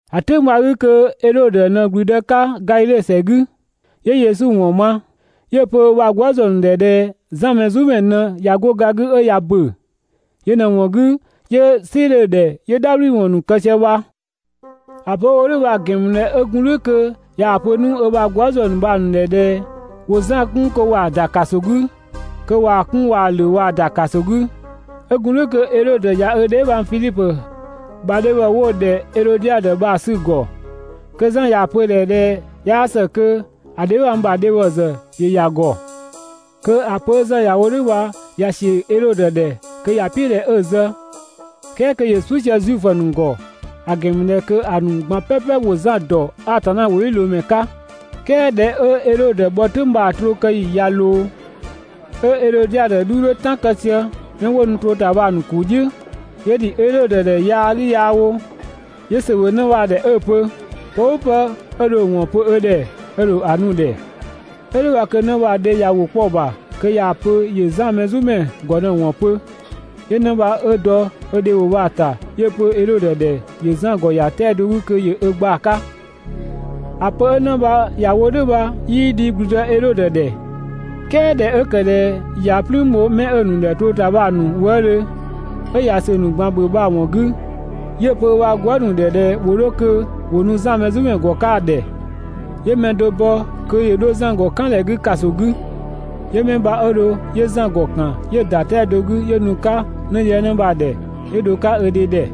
‑A "tʋ̈ng bha‑ 'gü kö Edhodö ꞊në ‑gblüdë 'ka Gadhidhe ‑sɛ 'gü, 'yö Yesu ‑wɔn ma. 'Yö‑ pö ö ‑bha gwëëzë ‑nu ‑dhɛ ꞊dhɛ Zan Mɛzumɛ ꞊në ꞊ya 'go ga 'gü 'ö ꞊ya ‑bö. Yö ꞊në‑ ‑wɔn 'gü 'yö "sɩ 'dhö‑ ‑dhɛ 'yö "dhabhliwɔn ‑nu kë sië bha. ‑A pö 'ö‑ wo "dhʋ̈ bha‑ ‑gɛn ‑mü ꞊dhɛ 'ö gun "dhʋ̈ kö ꞊yaa‑ pö 'nu ö ‑bha gwëëzë ‑nu bha‑ ‑nu ‑dhɛ ꞊dhɛ ‑wo Zan kun kö ‑wa ‑da ‑kaso 'gü. Kö ꞊waa‑ 'kun ꞊waa‑ ‑lö ꞊waa‑ ‑da ‑kaso 'gü. 'Ö gun "dhʋ̈ kö Edhodö ꞊ya ö dheebhang Fidhipö ‑bha dhebhɔ 'wo‑ ‑dhɛ Edhodiadö bha‑ 'sü‑ ‑gɔ. Kö Zan ꞊yaa‑ pö‑ ‑dhɛ ꞊dhɛ 'yaa ‑së kö ‑a dheebhang ‑bha dhebhɔ ‑zë ‑yö ‑ya ‑gɔ. Kö ‑a pö 'ö Zan ‑ya wo "dhʋ̈ bha ꞊ya ꞊sië Edhodö ‑dhɛ kö ‑ya "piʋ̈ ꞊dhɛ 'ö‑ zë, "kɛɛ kö ‑yö "suʋ̈ sië Zuifö ‑nu ‑gɔ, ‑a ‑gɛn ‑mü ꞊dhɛ kö ‑a ‑nu ꞊gban "pɛpɛ ‑wo Zan ‑dɔ Atanna ‑wʋdhiʋ̈loomɛ 'ka. "Kɛɛ ꞊dhɛ 'ö Edhodö bhɔ "tʋ̈ng bha‑ trookëyi ꞊ya ꞊loo, 'ö Edhodiadö 'dhu 'dhö "tan kë sië 'mɛ 'wo nu troo ‑ta bha‑ ‑nu ‑kuu "dhiʋ̈, 'yö ‑dhi Edhodö ‑dhɛ yaa 'gü yaa wo. 'Yö ‑sö ‑bhö 'në bha‑ ‑dhɛ 'ö‑ pö: «Pë "ʋʋ pë 'ö dho‑ ‑wɔn pö ö ‑dhɛ ö ‑dho ‑a nu‑ ‑dhɛ. 'Ö "dhʋ̈ bha kö 'në bha‑ dhe ꞊ya ‑wʋ 'kpɔ‑ ‑bha kö ꞊yaa‑ pö ‑yö Zan Mɛzumɛ ‑gɔ ꞊në ‑wɔn pö. 'Yö 'në bha 'ö dɔ ö dhe ‑wʋ bha‑ ‑ta 'yö‑ pö Edhodö ‑dhɛ ‑yö Zan ‑gɔ ‑ya 'tɛa‑ do 'gü kö ‑yö ö gba‑ 'ka. ‑A pö 'ö 'në bha ‑ya wo "dhʋ̈ bha 'yii dhi ‑gblüdë Edhodö ‑dhɛ, "kɛɛ ꞊dhɛ 'ö ‑kë ꞊dhɛ ꞊ya "plüün bho 'mɛ 'ö‑ ‑nu ‑dhɛ troo ‑ta bha‑ ‑nu wëëdhö 'ö ꞊ya ‑sö ‑nu ꞊gban ‑bhö bha‑ ‑wɔn 'gü, 'yö‑ pö ö ‑bha gwëë" ‑nu ‑dhɛ ꞊dhɛ ‑wo 'dho kö ‑wo nu Zan Mɛzumɛ ‑gɔ 'ka‑ ‑dhɛ. 'Yö mɛ do bɔ kö ‑yö 'dho Zan ‑gɔ "kan ‑dhɛ 'gü ‑kaso 'kɔ 'gü. 'Yö 'mɛ bha 'ö dho 'yö Zan ‑gɔ ‑kan 'yö ‑da 'tɛa‑ do 'gü 'yö nu‑ 'ka 'nëdhiëngnë bha‑ ‑dhɛ, 'yö dho‑ 'ka ö dhe ‑dhɛ.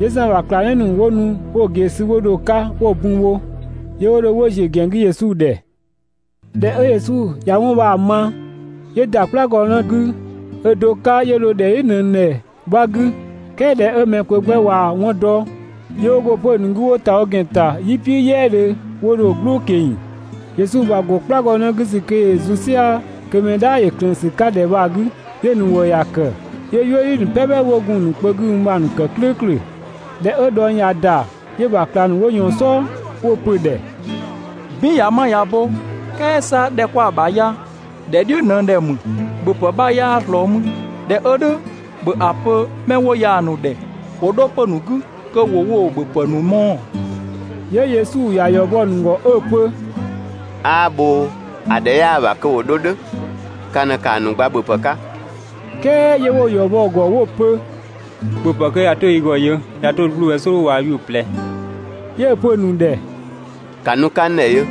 'Yö Zan ‑bha ꞊klangdhiʋ̈ ‑nu 'wo nu 'wo‑ ꞊gee sü 'wo dho‑ 'ka 'wo‑ bun bho, 'yö 'wo dho 'wo ‑ziö ‑gɛn 'gü Yesu ‑dhɛ. ꞊Dhɛ 'ö Yesu ꞊ya 'wɔn bha‑ ma, 'yö ‑da "kplagɔnë 'gü ö do 'ka 'yö dho ‑dhɛ "dhiʋ̈ ꞊nëng ‑dhɛ 'bha 'gü. "Kɛɛ ꞊dhɛ 'ö mɛ kpö 'gbɛ ꞊waa‑ 'wɔn ‑dɔ, 'yö 'wo go 'pö‑ ‑nu 'gü 'wo ‑ta wo ‑gɛn ‑ta "yi "piʋ̈ "yɛɛdhö 'wo dho‑ "gblʋʋ ꞊keng‑. Yesu ‑bha ‑go "kplagɔnë 'gü ‑sü kö ‑yö zun "sia‑ kö mɛ "dhaa ‑yö ꞊klëën ‑sü 'ka ‑dhɛ bha‑ 'gü, 'yö‑ ‑nu ‑wëë ‑ya ‑kë, 'yö "yuëdhi ‑nu "pɛpɛ 'wo gun‑ ‑nu kpö 'gü mü bha‑ ‑nu ‑kë "klʋ̈ʋ̈klʋ̈. ꞊Dhɛ 'ö dhɔng ꞊ya ‑da, 'yö‑ ‑bha ꞊klang ‑nu 'wo ꞊yɔɔn‑ "sɔɔ 'wo‑ pö‑ ‑dhɛ: «"Bin ꞊ya 'ma ꞊ya bo, "kɛɛ 'sa ‑dhɛ 'kwa‑ ‑bha ya ‑dhɛ "dhiʋ̈ ꞊nëng ‑dhɛ ‑mü, ‑bhöpë 'bha 'yaa ꞊slɔɔ mü, ꞊dhɛ 'ö "dhʋ̈ ‑bhö ‑a pö 'mɛ 'wo ya‑ ‑nu ‑dhɛ ‑wo 'dho 'pö‑ ‑nu 'gü kö ‑wo woo‑ ‑bhöpë ‑nu mɔɔ‑!» 'Yö Yesu ‑ya ‑yɔ bɔ‑ ‑nu ‑gɔ 'ö‑ pö: «'Aa bhoo, ‑a ‑dhɛ 'yaa‑ ‑bha kö ‑wo 'dho "dhʋ̈, ka ꞊në ‑kaa ‑nu gba ‑bhöpë 'ka!» "Kɛɛ 'yö 'wo‑ ‑yɔ bɔ‑ ‑gɔ 'wo‑ pö: «‑Bhöpë 'kö ꞊ya 'to yi ‑gɔ yö ꞊ya 'to 'bluu‑ bhɛ "sɔɔdhu waa‑ 'yuʋ̈‑ ꞊plɛ.» 'Yö‑ pö‑ ‑nu ‑dhɛ: «‑Ka nu‑ 'ka n ‑dhɛ yö!»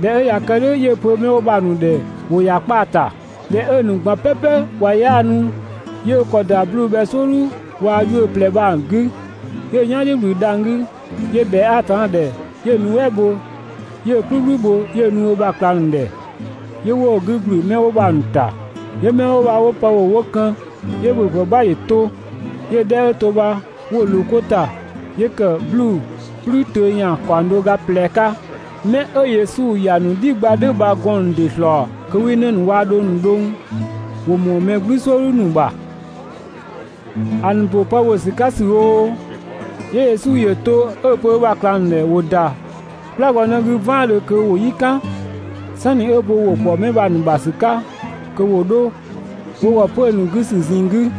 ꞊Dhɛ 'ö ꞊ya kë "dhʋ̈ 'yö‑ pö 'mɛ 'wo bha‑ ‑nu ‑dhɛ ‑wo ‑ya 'kpaa‑ ‑ta. ꞊Dhɛ 'ö‑ ‑nu ꞊gban "pɛpɛ ꞊wa 'yaanu, 'yö ö ‑kɔ ‑da 'bluu‑ bhɛ "sɔɔdhu waa‑ 'yuʋ̈‑ ꞊plɛ bha‑ 'gü, 'yö ö "yan "dhiʋ̈ ꞊wlü dhang‑ 'gü 'yö ꞊bhɛa Atanna ‑dhɛ 'yö‑ nuɛ" bho 'yö‑ "kplükplü bho 'yö‑ nu ö ‑bha ꞊klang ‑nu ‑dhɛ, 'yö 'wo‑ 'gü ‑gblü 'mɛ 'wo bha‑ ‑nu ‑ta. 'Yö 'mɛ 'wo bha 'wo pë ‑bhö 'wo kën, 'yö ‑bhöpë 'bha ‑yö to, 'yö‑ 'dhɛ 'ö to bha 'wo‑ ꞊loo 'ko ‑ta, 'yö ‑kë 'bluu‑ "kplü töö ‑yan ‑kaɔng do ga ꞊plɛ 'ka. 'Mɛ 'ö Yesu ‑ya ‑nu "dhi gba "dhʋ̈ bha‑ gɔɔn‑ ‑nu ‑dɩ ‑slɔɔ kö 'wii 'në ‑nu waa‑ dhong ‑nu dhʋng, ‑wo ‑mɔɔ mɛ "gblü "sɔɔdhu ‑nu ‑bha.» ‑A ‑nu ‑bö pë ‑bhö ‑sü 'ka ‑sü oo, 'yö Yesu ‑yö to 'ö‑ pö ö ‑bha ꞊klang ‑nu ‑dhɛ ‑wo ‑da "kplagɔnë 'gü "vaandhö kö ‑wo "yi "kan, "sanni ö ‑bo ‑wʋ ‑kpɔ 'mɛ bha‑ ‑nu ‑bha ‑sü kö ‑wo dho wo ‑gɔ 'pö‑ ‑nu 'gü ‑sü ꞊zinng 'gü.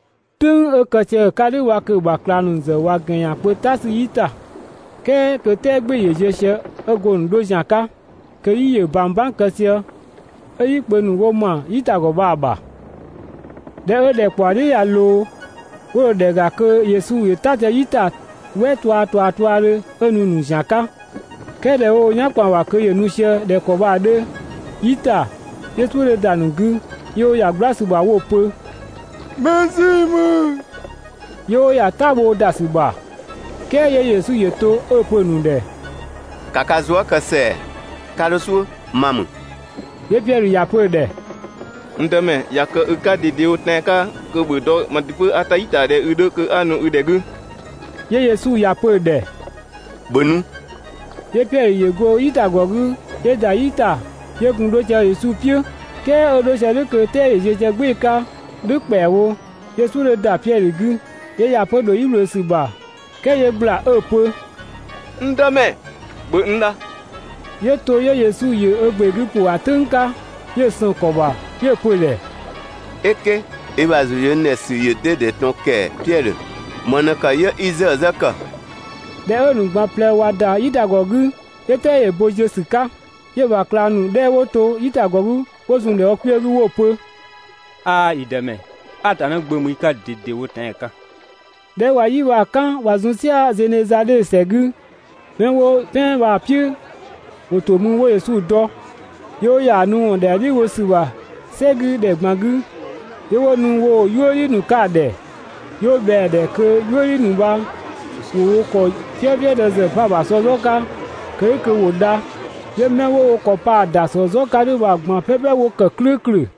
"Tʋ̈ng 'ö kë sië‑ 'ka "dhʋ̈ bha kö‑ ‑bha ꞊klang ‑nu ‑zë ꞊wa ‑gɛn ‑yan kpö "ta sü "yi ‑ta, "kɛɛ kö "tɛɛ "gbɩɩ‑ ‑yö ziö sië, 'ö go‑ ‑nu 'dho ‑zian 'ka, kö "yi ‑yö ꞊bang "bang kë sië 'ö "yi kpö ‑nu 'wo ‑ma "yitagɔ bha‑ ‑bha. ꞊Dhɛ 'ö ‑dhɛkpaɔ "dhiʋ̈ ꞊ya ꞊loo, 'wo dho ‑dhɛ ‑ga kö Yesu ‑yö "ta sië "yi ‑ta "wɛ tuaa ꞊tuaa tuaadhö 'ö nu‑ ‑nu ‑zian 'ka. "Kɛɛ ꞊dhɛ 'wo wo "yan ‑kpan ‑bha kö ‑yö nu sië ꞊dhɛ ‑kɔ bha‑ 'dhö "yi ‑ta, 'yö "suʋ̈ 'dhö ‑da ‑nu 'gü, 'yö 'wo ‑ya "gbla ‑sü ‑bha 'wo‑ pö: «Mɛ ‑zii ‑mü!» 'Yö 'wo ‑ya "ta bhoo ‑da ‑sü ‑bha. "Kɛɛ 'yö Yesu ‑yö to 'ö‑ pö‑ ‑nu ‑dhɛ: «‑Ka ka zuë" kë ‑sɛa, 'ka 'dho "suʋ̈, ma ‑mü!» 'Yö Piɛdhö ‑ya pö‑ ‑dhɛ: «N Dëmɛ, ꞊ya kë i 'ka ꞊dedewo tɛan‑ 'ka kö ‑bhö dɔ kö mang ‑dɩ 'pö 'a "ta "yi ‑ta ꞊dhɛ i 'dhö kö 'a nu i ‑dhɛ 'gü!» 'Yö Yesu ‑ya pö‑ ‑dhɛ: «‑Bhö nu!» 'Yö Piɛdhö ‑yö go "yitagɔ 'gü 'yö ‑da "yi ‑ta 'yö gun 'dho sië Yesu "piʋ̈. "Kɛɛ 'ö 'dho sië "dhʋ̈ kö "tɛɛ ‑yö ziö sië "gbɩɩ‑ 'ka "dhʋ̈ ‑kpɛawo, 'yö "suʋ̈ 'dhö ‑da Piɛdhö 'gü, 'yö ‑ya 'pö ‑dho "yi ꞊wlöö ‑sü ‑bha, "kɛɛ 'yö ꞊gbla 'ö‑ pö: «N Dëmɛ, ‑bhö n dha!» 'Yö to 'yö Yesu ‑yö ö ‑gbe 'gü ‑pʋ ‑a "tʋ̈ng 'ka 'yö‑ sën‑ ‑kɔ ‑bha 'yö‑ pö‑ ‑dhɛ: «"Eke, i ‑bha ‑zʋ ‑yö n ‑dhɛ ‑sü ‑yö 'dɛdɛ ꞊tɔn ‑kɛɛ, Piɛdhö! ‑Më ꞊në ‑kë 'yö 'i 'zëë‑ 'zë ‑kë?» ꞊Dhɛ 'ö‑ ‑nu ꞊gban ꞊plɛ ꞊wa ‑da "yitagɔ 'gü, 'yö "tɛɛ ‑yö bo ziö ‑sü 'ka. 'Yö‑ ‑bha ꞊klang ‑nu 'dhɛ 'wo to "yitagɔ 'gü 'wo zun‑ ‑dhɛ wo kpiö 'gü 'wo‑ pö: «'Aa, yi Dëmɛ, Atanna Gbö ‑mü i 'ka ꞊dedewo tɛan‑ 'ka!» ꞊Dhɛ 'ö ꞊wa "yi bha‑ "kan ꞊wa zun "sia‑ Zenezadhe ‑sɛ 'gü, 'mɛ 'wo "pɛan bha‑ "piʋ̈ ‑wo ‑to ‑mü 'wo Yesu dɔ, 'yö 'wo ‑ya ‑a nu ‑wɔn ‑dhɛa "dhiʋ̈ bho ‑sü ‑bha "sɛ 'gü ‑dhɛ ꞊gban 'gü 'yö 'wo nu woo‑ "yuëdhi ‑nu 'ka‑ ‑dhɛ. 'Yö 'wo ꞊bhɛa‑ ‑dhɛ kö "yuëdhi ‑nu bha ‑wo wo ‑kɔ "fiëfiëdë ‑zë 'pa‑ ‑bha ‑sɔ "zɔ 'ka (kë "dhʋ̈ kö ‑wo dha). 'Yö 'mɛ 'wo wo ‑kɔ pa‑ ‑dasɔ "zɔ 'ka "dhʋ̈ bha‑ ꞊gban "pɛpɛ 'wo ‑kë "klʋ̈ʋ̈klʋ̈.